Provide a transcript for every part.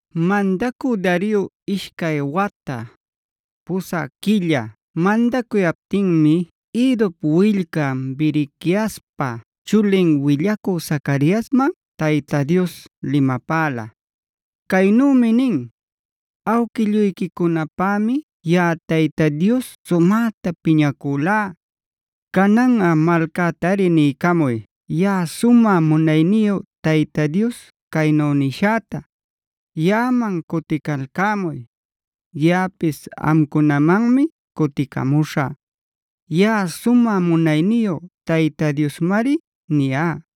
Mandacü Dario ishcay wata, pusä quilla mandacuyaptinmi Iddop willcan, Berequiaspa chulin willacü Zacariasman Tayta Dios limapäla. Caynümi nin: “Awquilluyquicunapämi yaꞌa Tayta Dios sumäta piñacülá. Cananꞌa malcätari niycamuy yaꞌa Sumä Munayniyu Tayta Dios caynu nishäta: ‘Yaꞌaman cuticalcämuy; yaꞌapis amcunamanmi cuticamuśhä. Yaꞌa sumä munayniyu Tayta Diosmari niyá.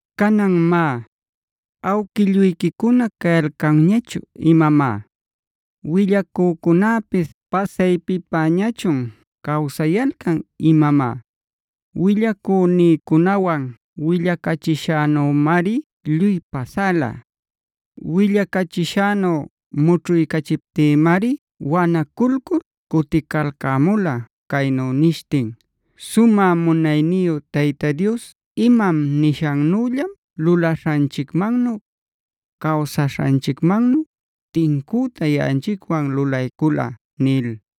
“ ‘Canan má, ¿awquilluyquicuna cayalcanñachun imamá? ¿Willacücunäpis pasaypipäñächun cawsayalcan imamá? Willacünïcunawan willacachishänümari lluy pasala. Willacachishänu mućhuycachiptïmari wanaculcul cuticalcämula caynu nishtin: “Sumä munayniyu Tayta Dios imam nishannüllam lulaśhanchicmannu, cawsaśhanchicmannu tincüta yaꞌanchicwan lulaycula”’” nil.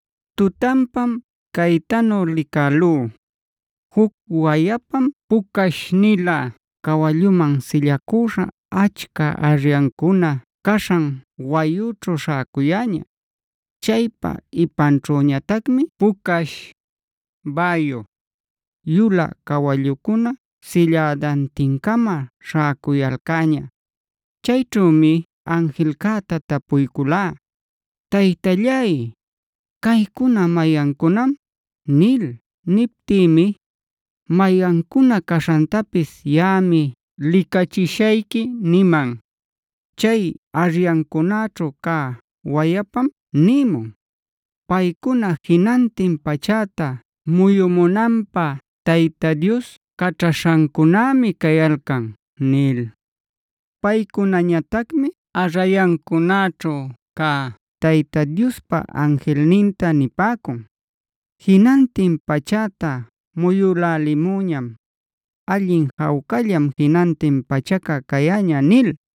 Tutanpam caytanu licälú: Juc wayapam pucash-nilä cawalluman sillacüśha achca arrayancuna caśhan wayućhu śhäcuyäña. Chaypa ipanćhüñatacmi pucash, bäyu, yulä cawallucuna sillädantin-cama śhäcuyalcäña. Chayćhümi anjilcäta tapuyculá: “Taytallay, ¿caycuna mayancunam?” nil. Niptïmi: “Mayancuna caśhantapis yaꞌami licachishayqui” niman. Chay arrayancunäćhu cä wayapam nimun: “Paycuna jinantin pachäta muyumunanpä Tayta Dios caćhaśhancunämi cayalcan” nil. Paycunañatacmi arrayancunäćhu cä Tayta Diospa anjilninta nipäcun: “Jinantin pachäta muyülälimüñam; allin jawcallam jinantin pachaca cayäña” nil.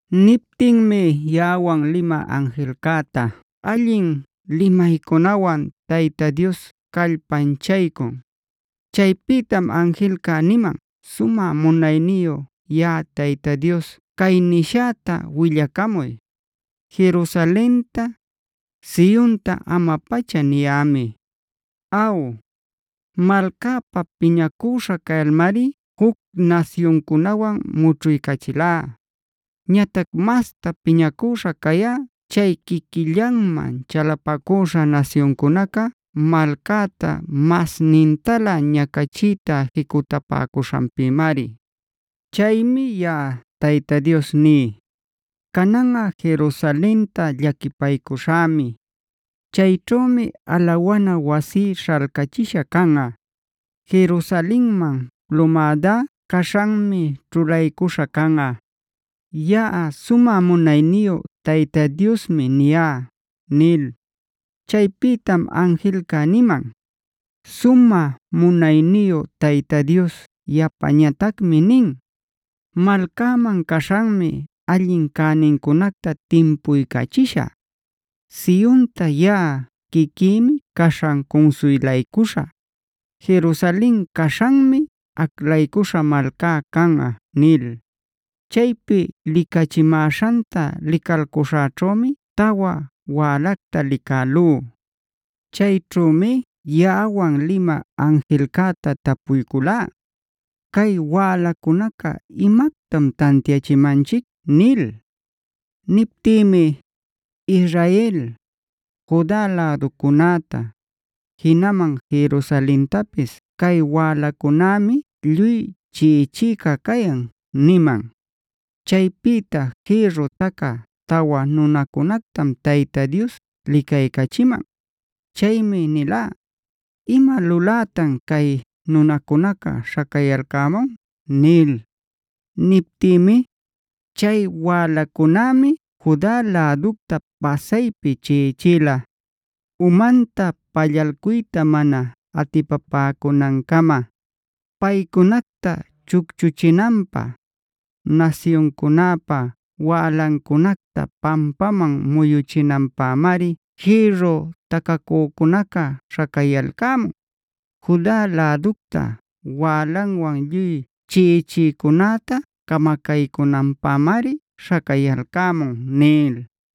Niptinmi yaꞌawan limä anjilcäta allin limaycunawan Tayta Dios callpanchaycun. Chaypïtam anjilca niman: “Sumä munayniyu yaꞌa Tayta Dios cay nishäta willacamuy: ‘Jerusalenta, Sionta ama-pacha niyämi. Aw, malcäpa piñacüśha cayalmari juc nasyuncunäwan mućhuycachilá. Ñatac masta piñacüśha cayá chay quiquillanman chalapacüśha nasyuncunaca malcäta masnintalä ñacachiyta jicutapäcuśhanpïmari. Chaymi yaꞌa Tayta Dios ní: Cananꞌa Jerusalenta llaquipaycuśhämi. Chayćhümi alawana wasí śhalcachisha canꞌa; Jerusalenman plumädá caśhanmi ćhulaycuśha canꞌa. Yaꞌa sumä munayniyu Tayta Diosmi niyá’” nil. Chaypïtam anjilca niman: “Sumä munayniyu Tayta Dios yapatacmi nin: ‘Malcäman caśhanmi allin cänincunacta timpuycachishä; Sionta yaꞌa quiquïmi caśhan cunsuylaycuśhä. Jerusalen caśhanmi aclaycuśha malcá canꞌa’” nil. Chaypi licachimäśhanta licalcuśhäćhümi tawa wälacta licälú. Chayćhümi yaꞌawan limä anjilcäta tapuyculá: “¿Cay wälacunaca imactam tantiachimanchic?” nil. Niptïmi: “Israel, Juda läducunäta, jinaman Jerusalentapis cay wälacunämi lluy chiꞌichïca cayan” niman. Chaypïta jïrru tacä tawa nunacunactam Tayta Dios licaycachiman. Chaymi nilá: “¿Ima lulätan cay nunacunaca śhacayalcämun?” nil. Niptïmi: “Chay wälacunämi Juda läducta pasaypi chiꞌichila, umanta pallalcuyta mana atipapäcunancama. Paycunacta chucchuchinanpä, nasyuncunäpa wälancunacta pampaman muyüchinanpämari jïrru tacäcunaca śhacayalcämun. Juda läducta wälanwan lluy chiꞌichïcunäta camacaycunanpämari śhacayalcämun” nil.